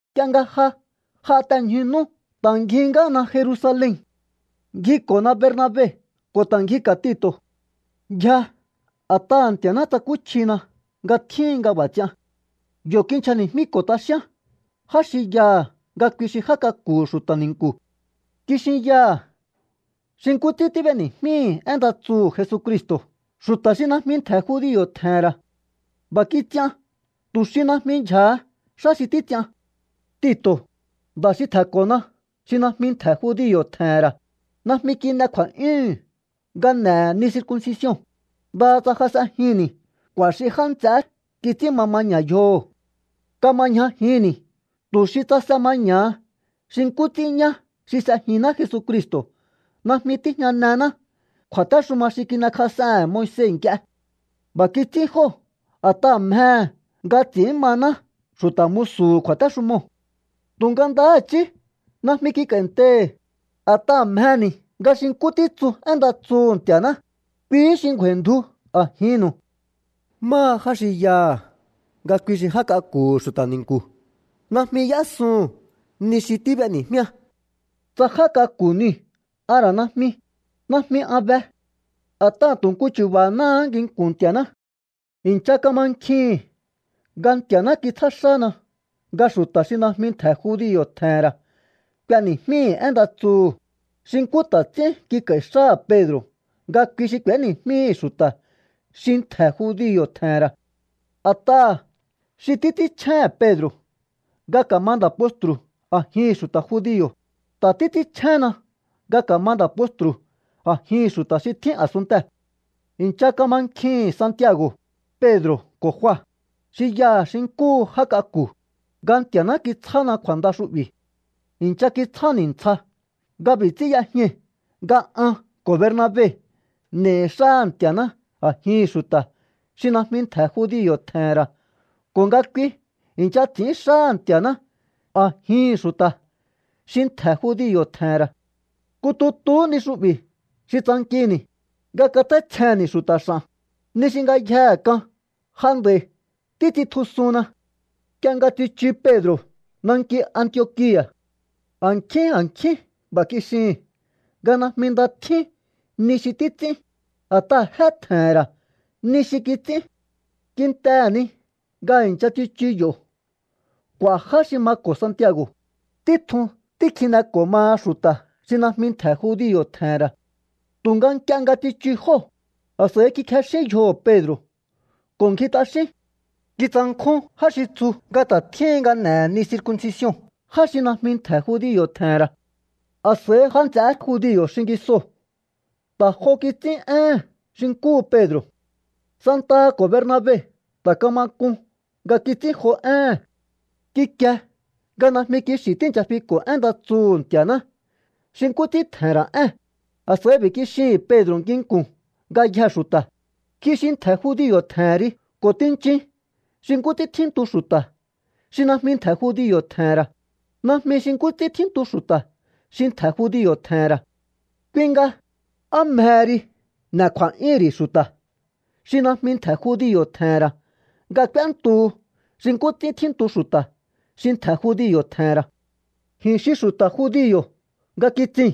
Nk'ie nga ja j'a te ñju nú ta̱ ngjihí ngáhana Jerusalen. Ngjiko̱na Bernabe ko̱ ta̱ ngjika̱ Tito̱. Ngjia a̱t'aha̱ Nti̱a̱ná tsakúchjina nga tjíhin nga b'a̱ ts'ian. Yo̱ kinchjani̱jmíko̱ t'axíán já xi yaha̱ nga kui xi já k'aku̱hu̱ xu̱ta̱ ni̱nku̱. Kixinyaha̱ xi nkú ts'ín tíb'eni̱jmíhi̱ én nda tsuhu̱ Jesucristo̱ xu̱ta̱ xi najmi ntje̱ judio̱ tje̱he̱n ra̱. B'a̱ kits'ian tu̱ xi najmi ndyja̱ha xá xi títs'ian. Tito̱, nda̱ xi tje̱nko̱na xi najmi ntje̱ judio̱ tje̱he̱n ra̱, najmi kin'e kju̱a̱'yúhu̱n nga n'e̱he̱ ni circuncision, ndaha tsa jas'enjinni̱ k'u̱a̱ xi já nts'eé kits'ín ma maña̱ yjoho̱. Kama ñjajinni̱ tu̱ xi tsase maña̱ha xi nkú ts'ín ñá xi s'ejinná Jesu Cristo̱ najmi tíjñanená kju̱a̱téxuma xi kin'ekjas'ehe̱n Moise nk'ie. B'a̱ kits'ín jóo̱ a̱t'aha̱ mjehe̱ nga ts'i̱ín maná xu̱ta̱ musu̱hu̱ kju̱a̱téxumoo̱. Tu̱nga ndahá i̱chí najmi kik'a̱i̱ntei̱hi̱, a̱ta̱ha̱ mjeni̱ nga xi nkú títsu én nda tsuhu̱ Nti̱a̱ná, kuihí xi ngju̱a̱i̱ndju a̱jinnu̱u. Máha já xi yaha̱ nga kui xi já k'aku̱hu̱ xu̱ta̱ ni̱nku̱, najmi y'ésuhu̱n ni xi tíb'eni̱jmíá. Tsa já k'aku̱ niu̱ a̱ ra̱ najmi, najmi an be. A̱t'aha̱ tu̱ nku chu̱ba̱náhá nginku̱n Nti̱a̱ná. I̱ncha kamankjihi̱n nga Nti̱a̱ná kitsjá xána nga xu̱ta̱ xi najmi ntje̱ judio̱ tje̱he̱n ra̱ k'ueni̱jmíhi̱ én nda tsuhu̱, xi nkú ta̱ ts'ín kik'a̱i̱ xáha̱ Pedro̱ nga kui xi k'u̱éni̱jmíhi̱ xu̱ta̱ xi ntje̱ judio̱ tje̱he̱n ra̱. A̱t'aha̱ xi títs'ínchjéhe̱n Pedro̱ nga ka̱ma nda̱ postru̱ a̱jihi̱n xu̱ta̱ judio̱, ta̱ títs'ínchjénna nga ka̱ma nda̱ postru̱ a̱jihi̱n xu̱ta̱ xi tjín a̱sunntee̱. I̱ncha kamankjihi̱n Santiago̱, Pedro̱ ko̱ Jua, xi yaha̱ xi nkúhu já k'aku̱, nga Nti̱a̱ná kitsjána kju̱a̱nda xu'bi̱. I̱ncha kitsjáni̱ ntsja nga b'i̱ ts'ín y'ejñai̱ nga an ko̱ Bernabe n'e̱i̱ xáha̱ Nti̱a̱ná a̱jihi̱n xu̱ta̱ xi najmi ntje̱ judio̱ tje̱he̱n ra̱ ko̱ nga kui i̱ncha ts'i̱ín xáha̱ Nti̱a̱ná a̱jihi̱n xu̱ta̱ xi ntje̱ judio̱ tje̱he̱n ra̱. Nku tutuhú ni xu'bi̱ xi tsankini̱, nga katj'áítsjenni̱ xu̱ta̱ x'a̱n, ni xi ngayjehe k'an ja nd'a̱i títs'intjusuhunna. Nk'ie nga tsichu Pedro̱ nanki Antiokia̱, a̱nkjín a̱nkjín b'a̱ kixihi̱n nga najmi nda tjín ni xi títs'ín, a̱t'aha̱ jé tje̱he̱n ra̱ ni xi kits'ín. Kintehe̱ ni nga i̱ncha tsichu yo̱ k'u̱a̱ já xi mako̱ Santiago̱, títjun tíkjineko̱ maha xu̱ta̱ xi najmi ntje̱ judio̱ tje̱he̱n ra̱. Tu̱nga nk'ie nga tsichu jóo̱, a̱s'a̱i kikjexín yjoho̱ Pedro̱ ko̱ ngji t'axín. Kitsankjún já xi tsu nga ta̱ tjíhin nga n'e̱he̱ ni circuncision já xi najmi ntje̱ judio̱ tje̱he̱n ra̱. A̱s'a̱i já nts'eé judio̱ xingisoo̱ ta̱ jo kits'ín éhe̱n xi nkúhu Pedro̱. Santaha ko̱ Bernabe ta̱ kama k'un nga kits'ín jo éhe̱n. Kikie nga najmi kixi̱ tíi̱ncha fiko̱ én nda tsuhu̱ Nti̱a̱ná xi nkú ts'ín tje̱he̱n ra̱ ée̱n, a̱s'a̱i b'i̱ kixihi̱n Pedro̱ nginku̱n ngayjee̱ xu̱ta̱: “Ji xi ntje̱ judio̱ tje̱hen ri ko̱ tinchin xi nkú ts'ín tjíntu xu̱ta̱ xi najmi ntje̱ judio̱ tje̱he̱n ra̱, najmi xi nkú ts'ín tjíntu xu̱ta̱ xi ntje̱ judio̱ tje̱he̱n ra̱. Kui nga, ¿á mjehe ri n'e̱ kju̱a̱'yúhu̱n ri̱ xu̱ta̱ xi najmi ntje̱ judio̱ tje̱he̱n ra̱ nga k'úéntuhu xi nkú ts'ín tjíntu xu̱ta̱ xi ntje̱ judio̱ tje̱he̱n ra̱?” Ji̱n xi xu̱ta̱ judio̱ nga kitsii̱n,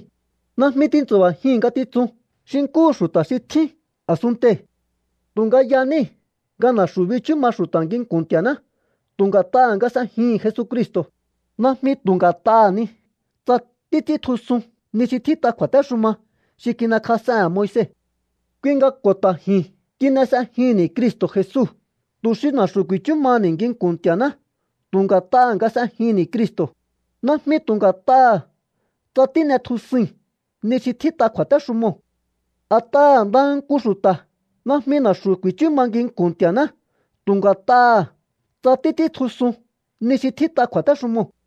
najmi tintsu̱ba̱jii̱n ngatitsun xi nkúhu xu̱ta̱ xi tjín a̱sunntei̱. Tu̱nga yaníi̱ nga na̱xu̱ bichú ma xu̱ta̱ nginku̱n Nti̱a̱ná tu̱ nga̱t'aha̱ nga s'ejihi̱n Jesucristo̱, najmi tu̱ nga̱t'aha̱ ni tsa títs'íntjusun ni xi tjít'a kju̱a̱téxuma xi kin'ekjas'ehe̱n Moise. Kui nga ko̱ ta̱ ji̱n kin'e s'ejihi̱nni̱ Cristo̱ Jesu tu̱ xi na̱xu̱ ku̱i̱chú maha̱ni̱ nginku̱n Nti̱a̱ná tu̱ nga̱t'aha̱ nga s'ejinni̱ Cristo̱, najmi tu̱ nga̱t'aha̱ tsa tín'etjusui̱n ni xi tjít'a kju̱a̱téxumoo̱. A̱t'aha̱ ndaha nku xu̱ta̱ najmi na̱xu̱ ku̱i̱chú ma nginku̱n Nti̱a̱ná tu̱ nga̱t'aha̱ tsa títs'íntjusun ni xi tjít'a kju̱a̱téxumoo̱.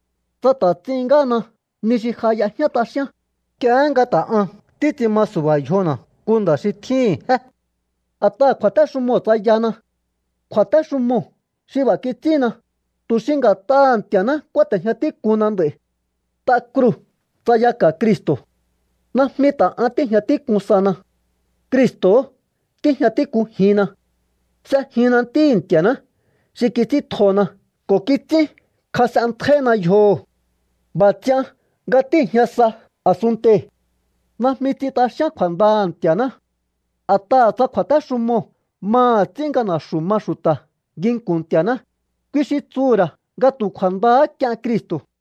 Tsa ta̱ ts'ihín ngáhana ni xi ja y'ejñá t'axíán, nk'iehé nga ta̱ ahan títs'in ma su̱ba̱ yjona̱ nku nda̱ xi tjíhi̱n jé. A̱t'aha̱ kju̱a̱téxumoo̱ tsayahana. Kju̱a̱téxumoo̱ xi b'a̱ kits'ínna, tu̱ xi nga̱t'aha̱ Nti̱a̱ná kúáte̱jña tík'uhunna nd'a̱i̱. T'a kruu̱ tsayaka̱ Cristo̱. Najmi ta̱ an tíi̱jña tík'un sahana. Cristo̱hó tíjña tík'unjinna. S'ejinna Ntíhi̱ Nti̱a̱ná xi kits'íntjona ko̱ kits'ínkjas'enntjaihina yjoho̱. B'a̱ ts'ian nga tíi̱jña sa a̱sunntei̱. Najmi ts'in t'axíán kju̱a̱ndaha̱ Nti̱a̱ná. A̱t'aha̱ tsa kju̱a̱téxumoo̱ maha̱ ts'ín nga na̱xu̱ ma xu̱ta̱ nginku̱n Nti̱a̱ná, kui xi tsuhu̱ ra̱ nga tu̱ kju̱a̱ndahá k'ien Cristo̱.